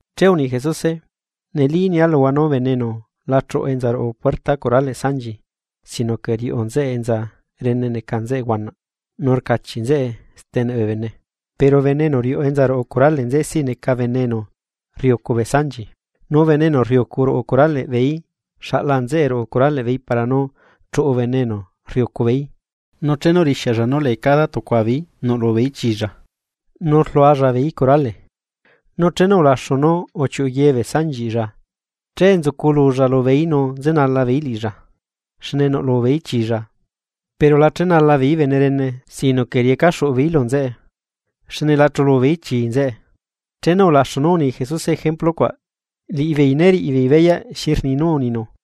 Che uni Jesuse: ―Neli nia luhua nú bene enu la chuꞌu enza ruꞌu puerta curaleꞌ sanchi sino que riuꞌu nzeꞌe enza rene neca nzeꞌe huanaꞌ nu rcachiꞌ nzeꞌe steneꞌ bee bene. Pero bene enu riuꞌu enza ruꞌu curale nzeꞌe siꞌ neca bene enu rriꞌiucu bee sanchi. Nu bene enu rriucu ruꞌu curaleꞌ beeí xaꞌla nzeꞌe ruꞌu curaleꞌ beeí para nú chuꞌu bene enu rriꞌiucu beeí nu chenu rixialla nú lee cada tucua beeí nuꞌlu beeí chilla. Nu rlualla beeí curale. Nu chenu ulaxu nú uchiuꞌu ye bee sanchiꞌlla che nzucululla lubeeí nu nzenala beeí liꞌilla, xne nuꞌlu beeí chilla. Pero la chenala beeí bene rene, sino que riecaxuꞌu beeí lu nzeꞌe, xne la chulu beeí chii nzeꞌe. Chenu ulaxu nú uni Jesuse ejemplu cuaꞌ liꞌibeei né riꞌi beei beyaꞌ xi rni nú uninu.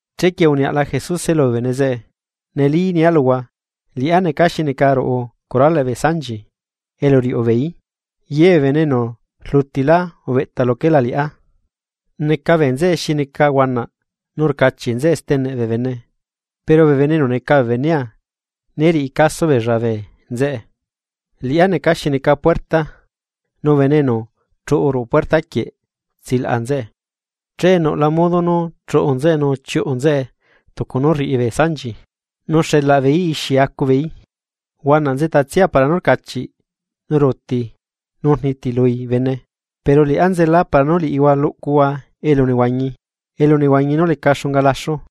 Chequie uniaꞌla Jesuse lubee bene zeꞌe: ―Neli nia luhua, liꞌá neca xi neca ruꞌu curaleꞌ bee sanchi elu riuꞌu beeí. Ye bee bene enu rlutilá ubeꞌta luquelá liꞌá neca bee nzeꞌe xi neca huanaꞌ nu rcachiꞌ nzeꞌe steneꞌ bee bene pero bee enu neca bee benea né riꞌi caso beella bee nzeꞌe. Liꞌá neca xi neca puerta, nu bene enu chuꞌu ruꞌu puerta quieꞌ tsilaꞌa nzeꞌe, che nuꞌla modo nú chuꞌu nzeꞌe nu chiuꞌu nzeꞌe tucu nú rriꞌi bee sanchi, nú xelaꞌ beeí ixi acubeeí. ’Huanaꞌ nzeꞌtatsia para nú rcachiꞌ nu ruuti nu rnitilui bene, pero liꞌá nzela para nú liꞌihua luꞌcuhua elunehuañi, elunehuañi nú leca xunga laxu.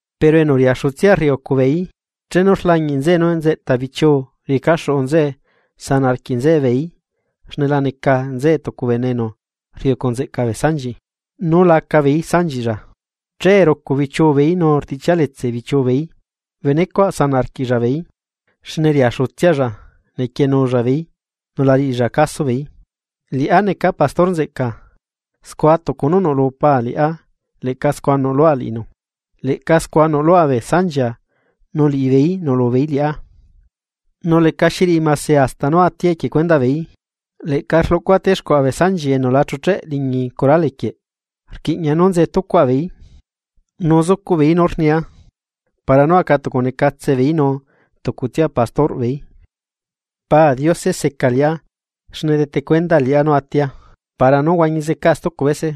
Pero enu riaxutsia rriucu beeí, chenu rlañiꞌ nzeꞌe nú nzeꞌta bichiu riecaxuꞌu nzeꞌe sanaꞌ arquiꞌ nzeꞌe beeí xne la neca nzeꞌe tucu bene enu rriꞌiucu nzeꞌca bee sanchi nu laca beeí sanchiꞌlla, che rucu bichiu beeí nu rtiꞌchialetse bichiu beeí. Bene cuaꞌ sanaꞌ arquiꞌlla beeí, xne riaxutsialla nequienulla beeí nu la riꞌilla caso beeí. ’Liꞌá neca bene enu rriꞌiucu nzeꞌca bee sanchiꞌ, scua tucu nú nuꞌlu Paa liꞌá leꞌca scua nuꞌlua liꞌinu, leꞌca scua nuꞌlua bee sanchia nu liꞌibeeí nuꞌlu beeí liꞌá. Nu lecaxi riꞌi mase hasta nú atia equie cuendaꞌ beeí. Leꞌca rluꞌcua stexcuaꞌa bee sanchi enu la chucheꞌ liñi curale quieꞌ, rquiꞌña nú nzetucuaꞌa beeí, nu zucuꞌbeeí nú rnia, para nú acatucunecatse beeí nu tucutsia enu riꞌiucu beeí. ’Pa Diose seca liꞌá xne rdete cuendaa liꞌá nú atia, para nú huañi zecaa stucu bese.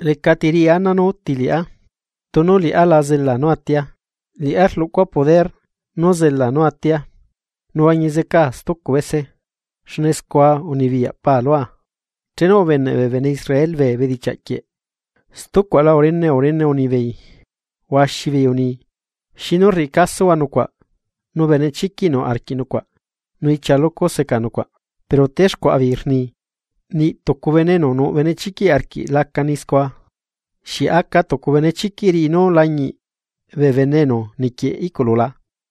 Lecati riꞌi ana nú uti liꞌá, tunu liꞌá la zela nú atia, liꞌá rluꞌcua poder nu zela nú atia, nu huañi zecaa stucu bese xne scua unibiyaꞌ Paa lua. Chenu ubeneꞌ bee bene Israel bee bedichiaꞌ quieꞌ, stucuaꞌla urene urene unibeei. Huaxi beei uni: ―¿Xinu rriꞌi casohua nucuaꞌ nu benechiquiꞌ nuꞌ arquiꞌ nucuaꞌ nu ichia lucu seca nucuaꞌ? Pero texcuaꞌa beei rni: ―Niꞌ tucu bene enu nuꞌ benechiquiꞌ arquiꞌ laca ni scua. ¿Xieꞌ aca tucu benechiquiꞌ riꞌi nú lañiꞌ bee bene enu niquieꞌ iꞌculu la?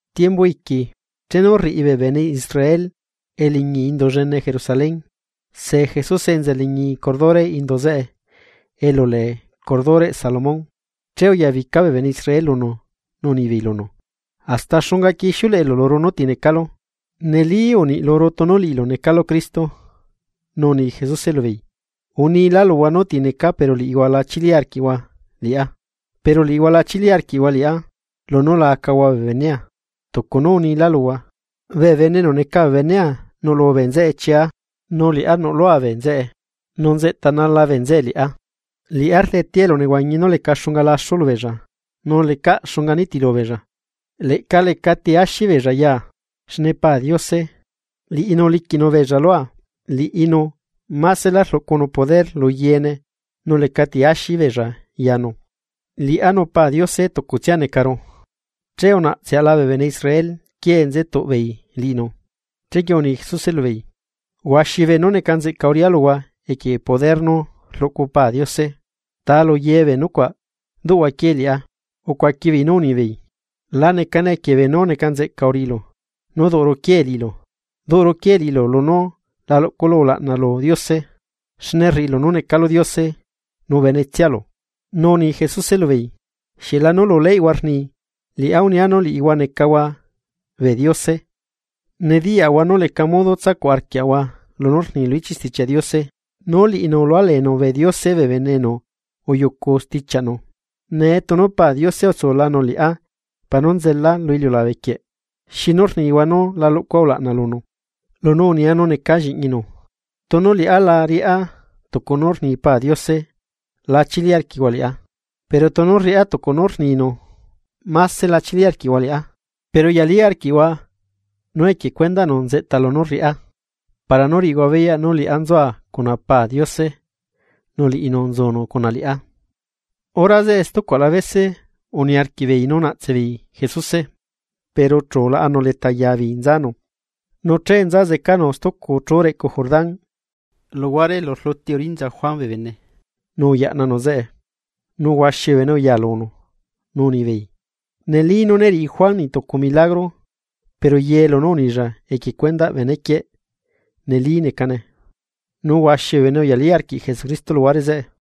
Tiembu iqui, chenu rriꞌi bee bene Israel eliñi Indu llene Jerusalén, se Jesuse enza liñi curdureꞌ indu zeꞌe elu lee curdureꞌ Salomón. Che uyabica bee bene Israel lunu nu unibeei lunu: ―¿Hasta xungaquie ixiuleꞌelu luru nú ti necalu? Neli uniꞌ luru tunu liꞌilu necalu Cristo. Nu uni Jesuse lubeei: ―Unilá luhua nú ti necaa pero liꞌihua la chili arquiꞌhua Liꞌá. Pero liꞌihua la chili arquiꞌhua liꞌá, lunú la acahua bee benea. Tucu nú unilá luhua. Bee bene enu neca bee benea nuꞌlu bee nzeꞌe chia nu liꞌá nuꞌlua bee nzeꞌe nu nzeꞌtanala bee nzeꞌe liꞌá. Liꞌá rdetea elunehuañi nú leca xunga laxu lubeella, nu lecaꞌ xunga nitilu beella, leꞌca lecati axi beella yaa. Xne Pa Diose, liꞌinu uliquiꞌnu beella lua, liꞌinu másela rluꞌcunu poder lu yeene nu lecati axi beella yanu. Liꞌá nu Pa Diose tucutsia necaru. Che unaꞌtseaꞌla bee bene Israel quiee nzetuꞌbeei liꞌinu. Chequie uni Jesuse lubeei: ―Huaxi beenú neca nzeꞌca uriꞌá luhua equie poder nú rluꞌcu Pa Diose, ¿ta luye bee nucuaꞌ, duꞌhua quiee liꞌá? Ucuaqui beei nú unibeei: ―La necane equie beenú neca nzeꞌca uriꞌilu, nú duꞌuru quiee liꞌilu. Duꞌuru quiee liꞌilu lunú la luꞌculu ulaꞌna lu Diose, xne rriꞌilu nú necalu Diose nu benetsialu. Nu uni Jesuse lubeei: ―Xieꞌlanu lu leyꞌhua rni: “Liꞌá unia nú liꞌihua necahua bee diose.” Nediyaꞌahua nú leca modo tsacuꞌ arquiaꞌahua lunú rni lu ichiꞌ Stichiaꞌ Diose. Nú liꞌinu ulualenu bee diose bee bene enu uyucu stichiaꞌnu. Nee tunu Pa Diose utsulanu liꞌá para nú nzelaa lu iliulabe quieꞌ. ¿Xinu rnihua nú la luꞌcua ulaꞌna lunu, lunú unia nú necaa lliꞌñinu? Tunu liꞌá la riꞌá tucu nú rni Pa Diose la chili arquiꞌhua liꞌá. Pero tunu rriꞌá tucu nú rninu mase la chili arquiꞌhua liꞌá, pero uyalí arquiꞌhua lunú rriꞌá, para nú riꞌihua beyaꞌ nú liꞌá nzua cuna Pa Diose nu liꞌinu nzunu cuna liꞌá. Hora zeꞌe stucuaꞌla bese uniarquiꞌ beei nú naꞌtse beei Jesuse, pero chu ulaꞌanu leta yaa beei nzanu. Nu che nza zecanu stucu chú reꞌcu Jordán, luguare elu rluti urinza Juan bee bene, nu uyaꞌnanu zeꞌe. Nu huaxi bee bene uya lunu, nu unibeei: ―Neli, nú né riꞌi Juan niꞌ tucu milagro. Pero ye lunú unilla equie cuendaꞌ bene quieꞌ, neli necane. Nu huaxi bee bene uyalí arquiꞌ Jesucristo luhuare zeꞌe.